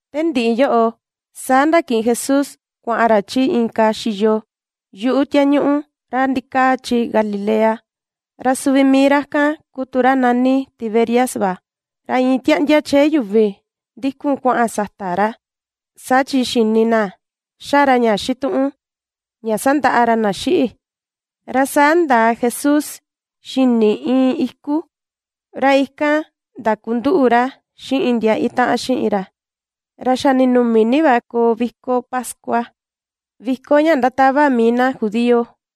Te ndiꞌi yoꞌo, saa ndakiꞌin Jesús kuaꞌan ra chi inka xiyo yuꞌu tiañuꞌu ra ndikaa chi Galilea, ra suvi mii ra kan ku tu ra nani Tiberias va. Ra iin tiaꞌndia chee yuvi ndikun kuaꞌan sata ra, saa chi xini na ^xa ra ña xituꞌun ña sandaꞌa ra na xiꞌi. Ra saa ndaa Jesús xini iin iku, ra ikan ndakunduꞌu ra xiꞌin ndia itaꞌan xiꞌin ra. Ra xa ninumi ni va koo viko pascua, viko ña ndatava mii na judío.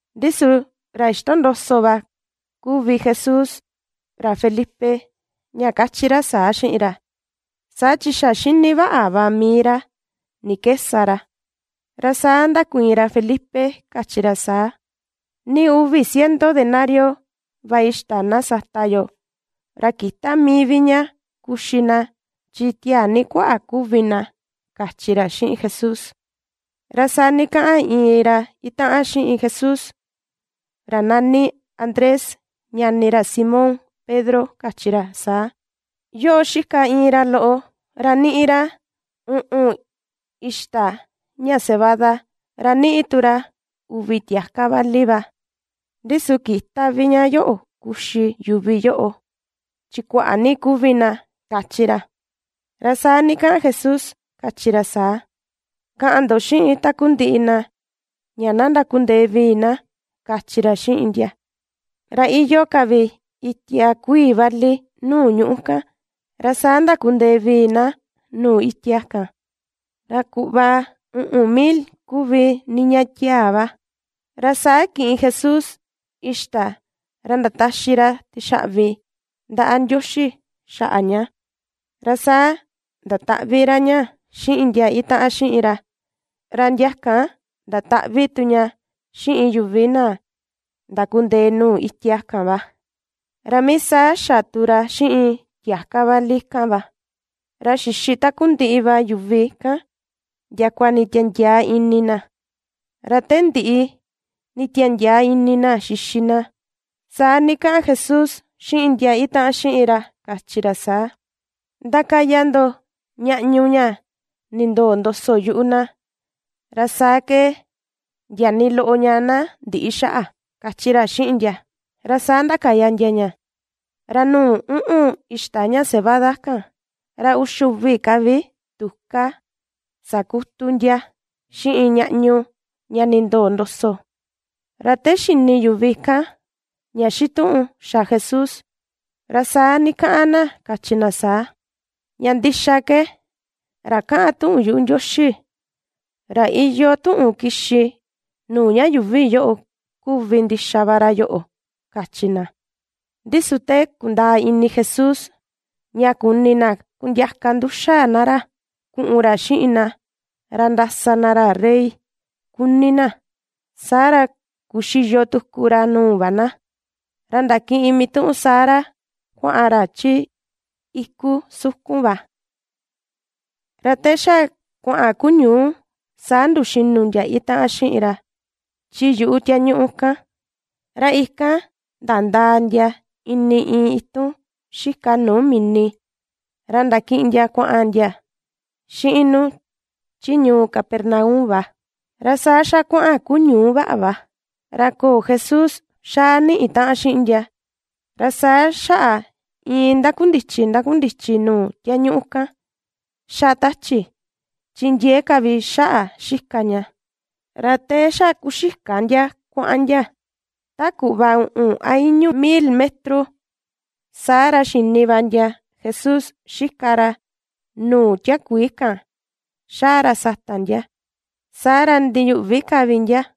Ndi su ra ixtondoso va Jesús kuvi ra Felipe ña kachi ra saa xiꞌin ra; saa chi xa xini vaꞌa va mii ra ni ke sa ra. Ra saa ndakuiin ra Felipe kachi ra saa: ―Nii uvi ciento denario va xita na sata yo, ra kïta mii vi ña kuxi na chi tiaa ni kuaꞌa kuvi na ―kachi ra xiꞌin Jesús. Ra saa ndikaꞌan iin ra itaꞌan xiꞌin Jesús, ra nani Andrés, ñani ra Simón Pedro kachi ra saa: ―Yoꞌo xika iin ra loꞌo ra niꞌi ra uꞌun xita ña cebada, ra niꞌi tu uvi tiaka vali va, ndi su kïta vi ña yoꞌo kuxi yuvi yoꞌo, chi kuaꞌa ni kuvi na ―kachi ra. Ra saa ndikaꞌan Jesús kachi ra saa: ―Kaꞌan ndo xiꞌin takundiꞌi na ña na ndakundee vii na ―kachi ra xiꞌin ndia. Ra iyoo ka vi itia kuii vali nuu ñuꞌu kan, ra saa ndakundee vii na nuu itia kan, ra kuꞌva uꞌun mil kuvi niña tiaa va. Ra saa kiꞌin Jesús xita, ra ndataxi ra tixaꞌvi ndaꞌa Ndioxi xaꞌa ña, ra saa ndataꞌvi ra ña xiꞌin ndia itaꞌan xiꞌin ra, ra ndia kan ndataꞌvi tu ña xiꞌin yuvi na ndakundee nuu itia kan va. Ra mii saa xa tu ra xiꞌin tiaka vali kan va, ra xixi takundiꞌi va yuvi kan ndiakua nditiandiaa ini na. Ra te ndiꞌi nditiandiaa ini na xixi na, saa ndikaꞌan Jesús xiꞌin ndia itaꞌan xiꞌin ra kachi ra saa: ―Ndakaya ndo ñaꞌñu ña nindoo ndoso yuꞌu na, ra saa ke ndia nii loꞌo ña na ndïꞌi xaꞌa ―kachi ra xiꞌin ndia. Ra saa ndakaya ndia ña, ra nuu uꞌun ixta ña cebada kan, ra uxi uvi ka vi tuka sakutu ndia xiꞌin ñaꞌñu ña nindoo ndoso. Ra te xini yuvi kan ña xituꞌun xa Jesús, ra saa ndikaꞌan na kachi na saa: ―Ña ndixa ke ra kaꞌan tuꞌun yuꞌu Ndioxi, ra iyoo tuꞌun kixi nuu ña yuuvi yoꞌo kuvi ndixa va ra yoꞌo ―kachi na. Ndi su te kundaa ini Jesús ña kuni na kundiaka nduxa na ra kuꞌun ra xiꞌin na, ra ndasa na ra rey kuni na, saa ra kuxiyo tuku ra nuu va na, ra ndakiꞌin mituꞌun saa ra kuaꞌan ra chi iku sukun va. Ra te xa kuaꞌan kuñuu saa nduxinu ndia itaꞌan xiꞌin ra chi yuꞌu tiañuꞌu kan. Ra ikan ndandaa ndia ini iin itun xika nuu mini ra ndakiꞌin ndia kuaꞌan ndia xiꞌin nu chi ñuu Capernaum va. Ra saa xa kuaꞌan kuñuu vaꞌa va, ra köo Jesús xaa niꞌi taꞌan xiꞌin ndia. Ra saa xaꞌa iin ndakundichi ndakundichi nuu tiañuꞌu kan, ^xa tachi, chi ndiee ka vi xaꞌa xika ña. Ra te xa kuxika ndia kuaꞌan ndia ta kuꞌva uꞌun a i̱ñu̱ mil metro, saa ra xini va ndia Jesús xika ra nuu tiakuii kan xaa ra sata ndia, saa ra ndiyuꞌvi ka vi ndia.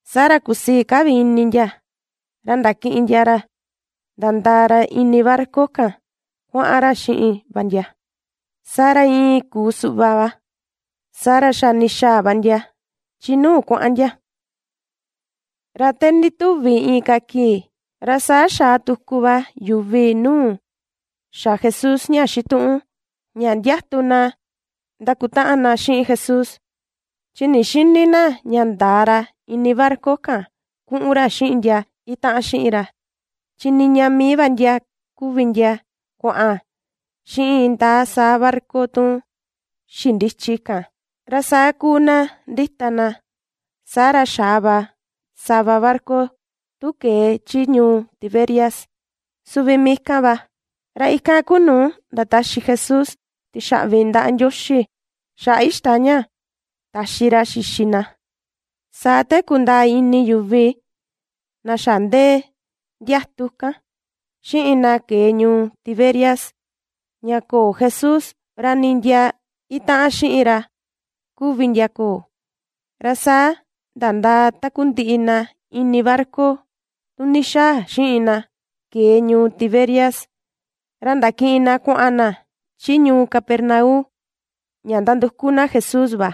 Saa ra kusii ka vi ini ndia ra ndakiꞌin ndia ra, ra nandaa ra ini barca kan kuaꞌan ra xiꞌin va ndia, saa ra iin kuu suꞌva va, saa ra xa ndixaa va ndia chi nu kuaꞌan ndia. Ra te ndituvi inka kii, ra saa xaa tuku va yuvi nuu xa Jesús ña xituꞌun ña ndiatu na ndakutaꞌan na xiꞌin Jesús, chi ndixïni na ña ndaa ra ini barca kan kuꞌun ra xiꞌin ndia itaꞌan xiꞌin ra, chi niña mii va ndia kuvi ndia kuaꞌan xiꞌin indaa saa barca tu xindichi kan. Ra saa kuu na ndita na, saa ra xaa va sava barca tu kee chi ñuu Tiberias, suvi mii kan va, ra ikan kuu nuu ndataxi Jesús tixaꞌvi ndaꞌa Ndioxi xaꞌa xita ña taxi ra xixi na. Saa te kundaa ini yuvi na xa ndee ndiatu kan, xiꞌin na kee ñuu Tiberias ña köo Jesús, ra nii ndia itaꞌan xiꞌin ra kuvi ndia köo, ra saa nandaa takundiꞌi na ini barca tu ndixaa xiꞌin na kee ñuu Tiberias, ra ndakiꞌin na kuaꞌan na chi ñuu Capernaum ña nanduku na Jesús va.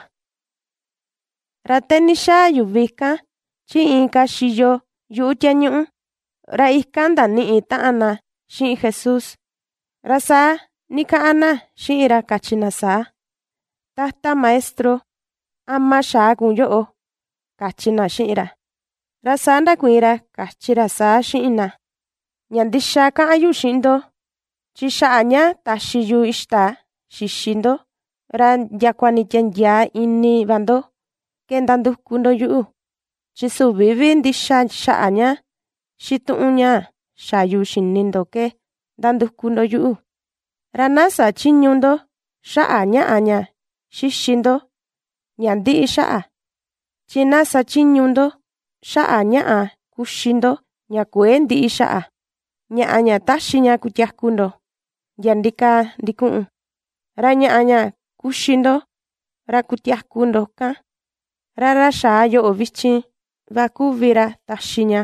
Ra te ndixaa yuvi kan chi inka xiyo yuꞌu tiañuꞌu, ra ikan ndaniꞌi taꞌan na xiꞌin Jesús, ra saa ndikaꞌan na xiꞌin ra kachi na saa: ―Tata Maestro, ¿ama xaa kun yoꞌo? ―kachi na xiꞌin ra. Ra saa ndakuiin ra kachi ra saa xiꞌin na: ―Ña ndixa kaꞌan yu xiꞌin ndo, chi xaꞌa ña taxi yu ixta xixi ndo ra ndiakua nditiandiaa ini va ndo ke nanduku ndo yuꞌu, chi süvi vi ndixa xaꞌa ña xituꞌun ña xa yu xini ndo ke nanduku ndo yuꞌu. Ra na sä chiñu ndo xaꞌa ñaꞌa ña xixi ndo ña ndiꞌi xaꞌa, chi na sa chiñu ndo xaꞌa ñaꞌa kuxi ndo ña kuëe ndiꞌi xaꞌa, ñaꞌa ña taxi ña kutiaku ndo, ndia ndikaa ndikuꞌun. Ra ñaꞌa ña kuxi ndo ra kutiaku ndo kan, ra ra xaa yoꞌo vichin va kuvi ra taxi ña,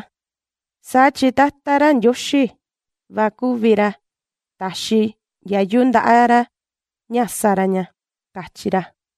saa chi Tata ra Ndioxi va kuvi ra taxi ndiayu ndaꞌa ra ña sa ra ña ―kachi ra.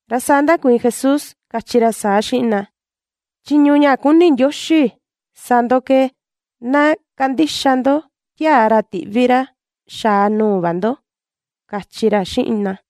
Ra saa ndakuiin Jesús kachi ra saa xiꞌin na: ―Chiñu ña kuni Ndioxi sa ndo ke, na kandixa ndo tiaa ra tiꞌvi ra xaa nuu va ndo ―kachi ra xiꞌin na.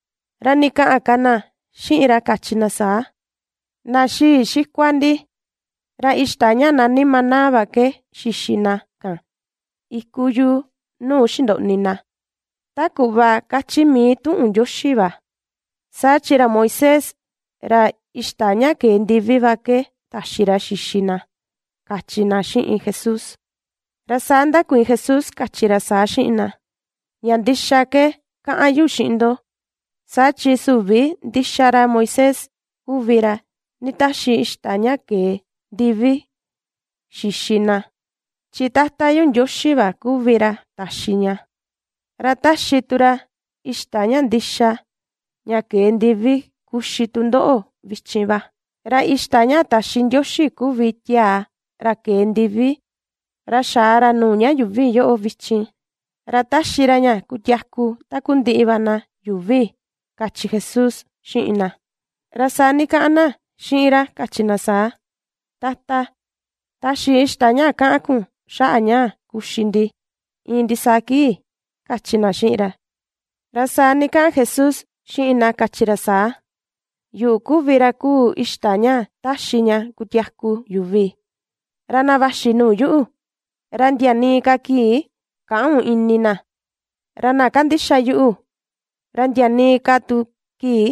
Ra ndikaꞌan ka na xiꞌin ra kachi na saa: ―Na xii xikua ndi ra ixta ña nani maná va ke xixi na kan iku yuu nuu xindoꞌni na, ta kuꞌva kachi mii tuꞌun Ndioxi va: “Saa chi ra Moisés ra ixta ña kee ndivi va ke taxi ra xixi na” ―kachi na xiꞌin Jesús. Ra saa ndakuiin Jesús kachi ra saa xiꞌin na: ―Ña ndixa ke kaꞌan yu xiꞌin ndo: Saa chi süvi ndixa ra Moisés kuvi ra nditaxi ixta ña kee ndivi xixi na, chi Tata yu Ndioxi va kuvi ra taxi ña, ra ^taxi tu ra ixta ña ndixa, ña kee ndivi kuxi tu ndoꞌo vichin va. Ra ixta ña taxi Ndioxi kuvi tiaa ra kee ndivi ra xaa ra nuu ña yuuvi yoꞌo vichin, ra ^taxi ra ña kutiaku takundiꞌi va na yuuvi ―kachi Jesús xiꞌin na. Ra saa ndikaꞌan na xiꞌin ra kachi na saa: ―Tata, taxi ixta ña kaꞌan kun xaꞌa ñaa kuxi ndi iin ndisaa kii ―kachi na xiꞌin ra. Ra saa ndikaꞌan Jesús xiꞌin na kachi ra saa: ―Yuꞌu kuvi ra kuu ixta ña ^taxi ña kutiaku yuvi. Ra na vaxi nuu yuꞌu, ra ndia nii ka kii käꞌun ini na, ra na kandixa yuꞌu, ra ndia nii ka tu kii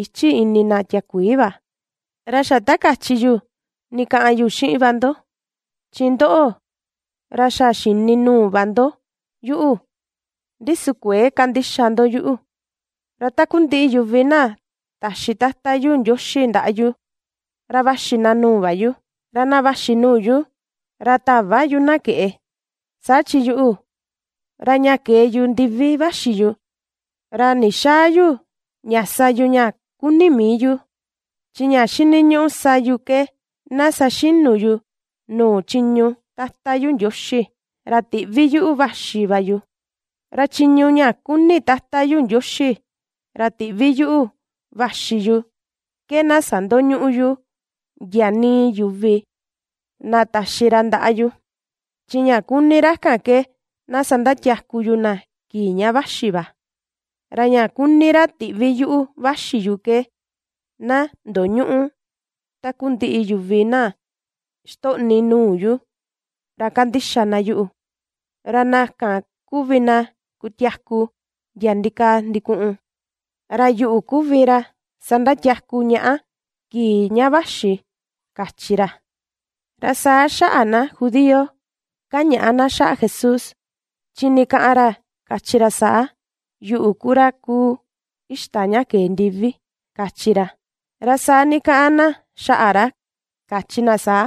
ïchi ini na tiakuii va. Ra xa ta kachi yu ndikaꞌan yu xiꞌin va ndo, chi ndoꞌo, ra xa xini nuu va ndo yuꞌu, ndi su kuëe kandixa ndo yuꞌu. Ra takundiꞌi yuvi na taxi Tata yu Ndioxi ndaꞌa yu, ra vaxi na nuu va yu, ra na vaxi nuu yu, ra täva yu na keꞌe. Saa chi yuꞌu, ra ña kee yu ndivi vaxi yu, ra ndixäa yu ña sa yu ña kuni mii yu, chi ña xiniñuꞌu sa yu ke na saxinu yu nuu chiñu Tata yu Ndioxi, ra tiꞌvi yuꞌu vaxi va yu. Ra chiñu ña kuni Tata yu Ndioxi ra tiꞌvi yuꞌu vaxi yu ke na sandoñüꞌu yu ndia nii yuvi na taxi ra ndaꞌa yu, chi ña kuni ra kan ke na sandatiaku yu na kii ña vaxi va. Ra ña kuni ra tiꞌvi yuꞌu vaxi yu ke: na ndoñüꞌu takundiꞌi yuvi na xitoꞌni nuu yu ra kandixa na yuꞌu, ra na kan kuvi na kutiaku ndia ndikaa ndikuꞌun; ra yuꞌu kuvi ra sandatiaku ñaꞌa kii ña vaxi ―kachi ra. Ra saa xaꞌa na judío kañaꞌa na xaꞌa Jesús, chi ndikaꞌan ra kachi ra saa: “Yuꞌu ku ra kuu ixta ña kee ndivi” ―kachi ra. Ra saa ndikaꞌan na xaꞌa ra kachi na saa: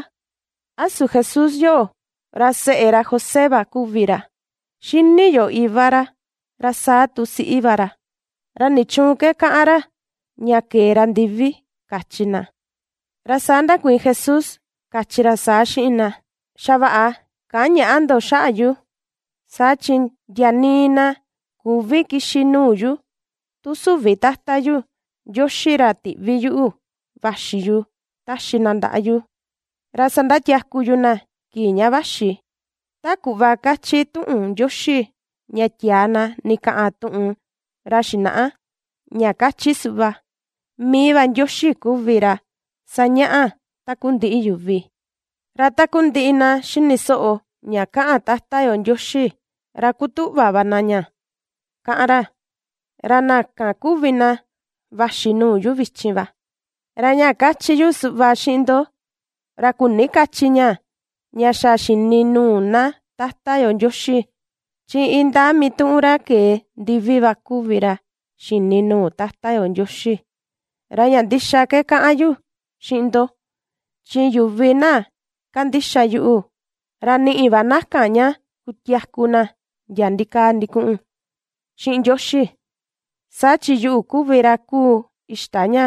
―¿A su Jesús yoꞌo, ra seꞌe ra José va kuvi ra? Xini yo iva ra, ra saa tu siꞌi va ra. ¿Ra nichuun ke kaꞌan ra ña kee ra ndivi? ―kachi na. Ra saa ndakuiin Jesús kachi ra saa xiꞌin na: ―Xavaꞌa käꞌan ñaꞌa ndo xaꞌa yu. Saa chi ndia nii na küvi kixi nuu yuꞌu, tu süvi tata yu Ndioxi ra tiꞌvi yuꞌu vaxi yu taxi na ndaꞌa yu, ra sandatiaku yu na kii ña vaxi. Ta kuꞌva kachi tuꞌun Ndioxi ña tiaa na ndikaꞌan tuꞌun ra xinaꞌa, ña kachi suꞌva: “Mii va Ndioxi kuvi ra sañaꞌa takundiꞌi yuvi.” Ra takundiꞌi na xini soꞌo ña kaꞌan Tata yo Ndioxi, ra kutuꞌva na ña kaꞌan ra, ra na kan kuvi na vaxi nuu yu vichin va. ’Ra ña kachi yu suꞌva xiꞌin ndo, ra küni kachi ña, ña xa xini nuu na Tata yo Ndioxi, chi indaa mituꞌun ra kee ndivi va kuvi ra xini nuu Tata yo Ndioxi. Ra ña ndixa ke kaꞌan yu xiꞌin ndo; chi yuvi na kandixa yuꞌu, ra niꞌi va na kan ña kutiaku na ndia ndikaa ndikuꞌun xiꞌin Ndioxi. Saa chi yuꞌu kuvi ra kuu ixta ña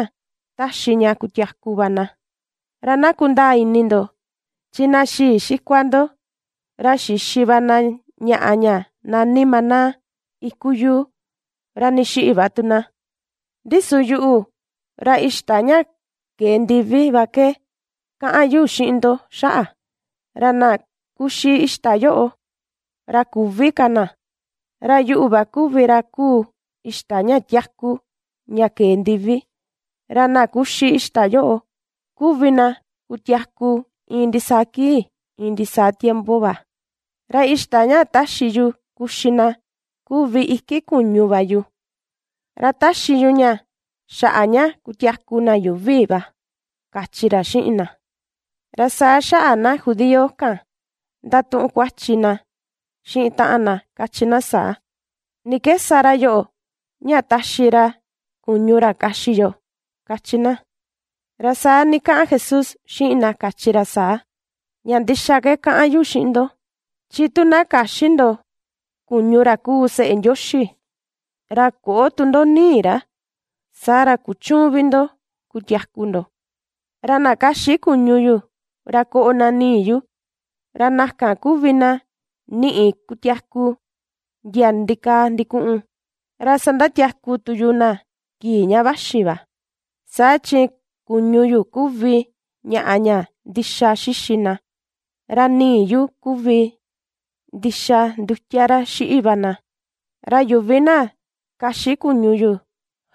^taxi ña kutiaku va na. Ra na kundaa ini ndo: Chi na xii xikua ndo ra xixi va na ñaꞌa ña nani maná iku yuu, ra ndixiꞌi va tu na, ndi su yuꞌu ra ixta ña kee ndivi va ke kaꞌan yu xiꞌin ndo xaꞌa; ra na kuxi ixta yoꞌo, ra küvi ka na. Ra Yuꞌu va kuvi ra kuu ixta ña tiaku ña kee ndivi; ra na kuxi ixta yoꞌo kuvi na kutiaku iin ndisaa kii iin ndisaa tiempo va; Ra ixta ña taxi yu kuxi na, kuvi iki kuñu va yu. Ra taxi yu ña xaꞌa ña kutiaku na yuuvi va ―kachi ra xiꞌin na. Ra saa xaꞌa na judío kan ndatuꞌun kuachi na xiꞌin taꞌan na kachi na saa: ―¿Ni ke sa ra yoꞌo ña taxi ra kuñu ra kaxi yo? ―kachi na. Ra saa ndikaꞌan Jesús xiꞌin na kachi ra saa: ―Ña ndixa ke kaꞌan yu xiꞌin ndo, chi tu na käxi ndo kuñu ra kuu Seꞌe Ndioxi, ra köꞌo tu ndo nii ra, saa ra kuchüun vi ndo kutiaku ndo. Ra na kaxi kuñu yu, ra koꞌo na nii yu, ra na kan kuvi na niꞌi kutiaku ndiaa ndikaa ndikuꞌun, ra sandatiaku tu yu na kii ña vaxi va. Saa chi kuñu yu kuvi ñaꞌa ña ndixa xixi na, ra nii yu kuvi ndixa ndutia ra xiꞌi va na. Ra yuvi na kaxi kuñu yu,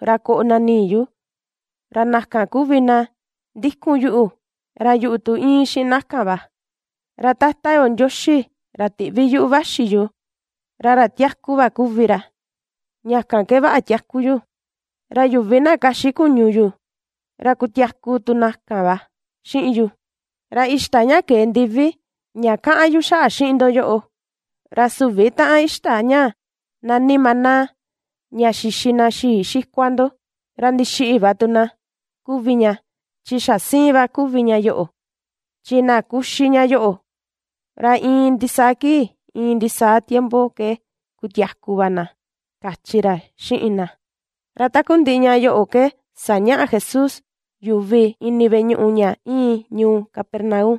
ra koꞌo na nii yu, ra na kan kuvi na ndikun yuꞌu, ra yuꞌu tu íin xiꞌin na kan va. Ra Tata yo Ndioxi ra tiꞌvi yuꞌu vaxi yu, ra ra tiaku va kuvi ra, ña kan ke vaꞌa tiaku yu, ra yuvi na kaxi kuñu yuꞌu, ra kutiaku tu na kan va xiꞌin yu. Ra ixta ña kee ndivi, ña kaꞌan yu xaꞌa xiꞌin ndo yoꞌo, ra süvi taꞌan ixta ña nani maná ña xixi na xii xikua ndo, ra ndixiꞌi va tu na kuvi ña, chi xa siin va kuvi ña yoꞌo, chi na kuxi ña yoꞌo, ra iin ndisaa kii iin ndisaa tiempo ke kutiaku va na ―kachi ra xiꞌin na. Ra takundiꞌi ña yoꞌo ke sañaꞌa Jesús yuvi ini veꞌe ñuꞌu ña íin ñuu Capernaum.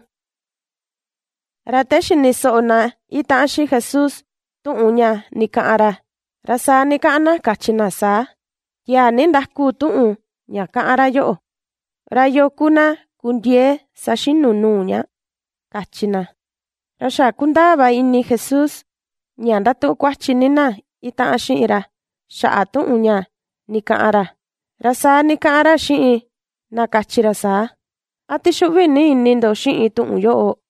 Ra te xini soꞌo na itaꞌan xiꞌin Jesús tuꞌun ña ndikaꞌan ra, ra saa ndikaꞌan na kachi na saa: ―Tiaa ni ndaku tuꞌun ña kaꞌan ra yoꞌo, ¿ra yoo ku na kundiee saxinu nuu ña? ―kachi na. Ra xa kundaa va ini Jesús ña ndatuꞌun kuachi ni na itaꞌan xiꞌin ra xaꞌa tuꞌun ña ndikaꞌan ra, ra saa ndikaꞌan ra xiꞌin na kachi ra saa: ―¿A ^tixuꞌvi ni ini ndo xiꞌin tuꞌun yoꞌo?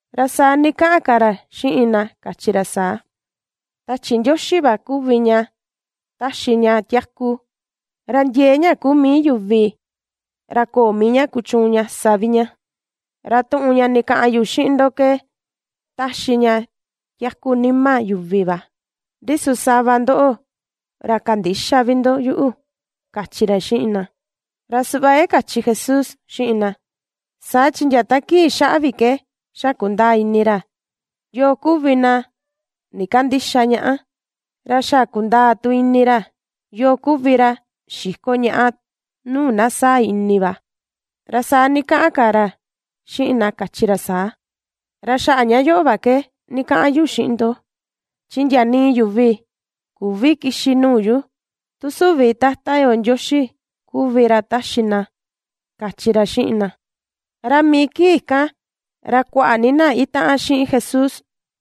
Ra saa ndikaꞌan ka ra xiꞌin na kachi ra saa: ―Tachi Ndioxi va kuvi ña taxi ña tiaku; ra ndiee ña kuu mii yuvi ra köo mii ña kuchuun ña sa vi ña. Ra tuꞌun ña ndikaꞌan yu xiꞌin ndo, ke taxi ña tiaku nima yuvi va. Ndi su sava ndo ra kandïxa vi ndo yuꞌu ―kachi ra xiꞌin na. Ra suꞌva ke kachi Jesús xiꞌin na, saa chi ndia ta kii xaꞌa vi ke xa kundaa ini ra, yoo kuvi na ndikandïxa ñaꞌa, ra xa kundaa tu ini ra, yoo kuvi ra xiko ñaꞌa nuu na sáa̱ ini va. Ra saa ndikaꞌan ka ra xiꞌin na kachi ra saa: ―Ra xaꞌa ña yoꞌo va ke ndikaꞌan yu xiꞌin ndo, chi ndia nii yuvi, küvi kixi nuu yu, tu süvi Tata yo Ndioxi kuvi ra taxi na ―kachi ra xiꞌin na. Ra mii kii kan ra kuaꞌa ni na itaꞌan xiꞌin Jesús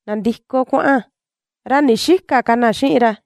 nandiko kuaꞌan, ra ndixïka ka na xiꞌin ra.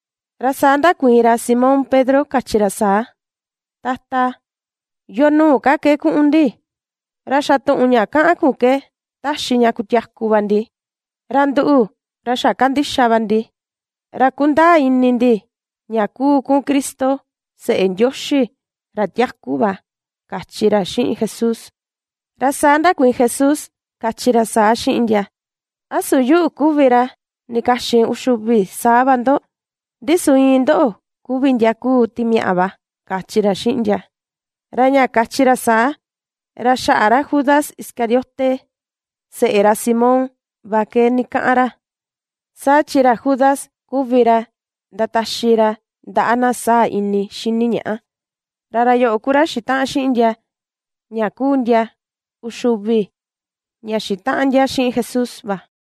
Ra saa ndakuiin ra Simón Pedro kachi ra saa: ―Tata, ¿yoo nuu ka ke kuꞌun ndi? Ra xa tuꞌun ña kaꞌan kun ke taxi ña kutiaku va ndi. Ra nduꞌu, ra xa kandixa va ndi, ra kundaa ini ndi ña kuu kun Cristo, Seꞌe Ndioxi ra tiaku va ―kachi ra xiꞌin Jesús. Ra saa ndakuiin Jesús kachi ra saa xiꞌin ndia: ―¿A su yuꞌu kuvi ra ndikaxin uxi uvi saa va ndo? Ndi su, iin ndoꞌo kuvi ndia kuu timiaꞌa va ―kachi ra xiꞌin ndia. Ra ña kachi ra saa, ra xaꞌa ra Judas Iscariote, seꞌe ra Simón va ke ndikaꞌan ra, saa chi ra Judas kuvi ra ndataxi ra ndaꞌa na sáa̱ ini xini ñaꞌa, ra ra yoꞌo ku ra xitaꞌan xiꞌin ndia ña kuu ndia uxi uvi ña xitaꞌan ndia xiꞌin Jesús va.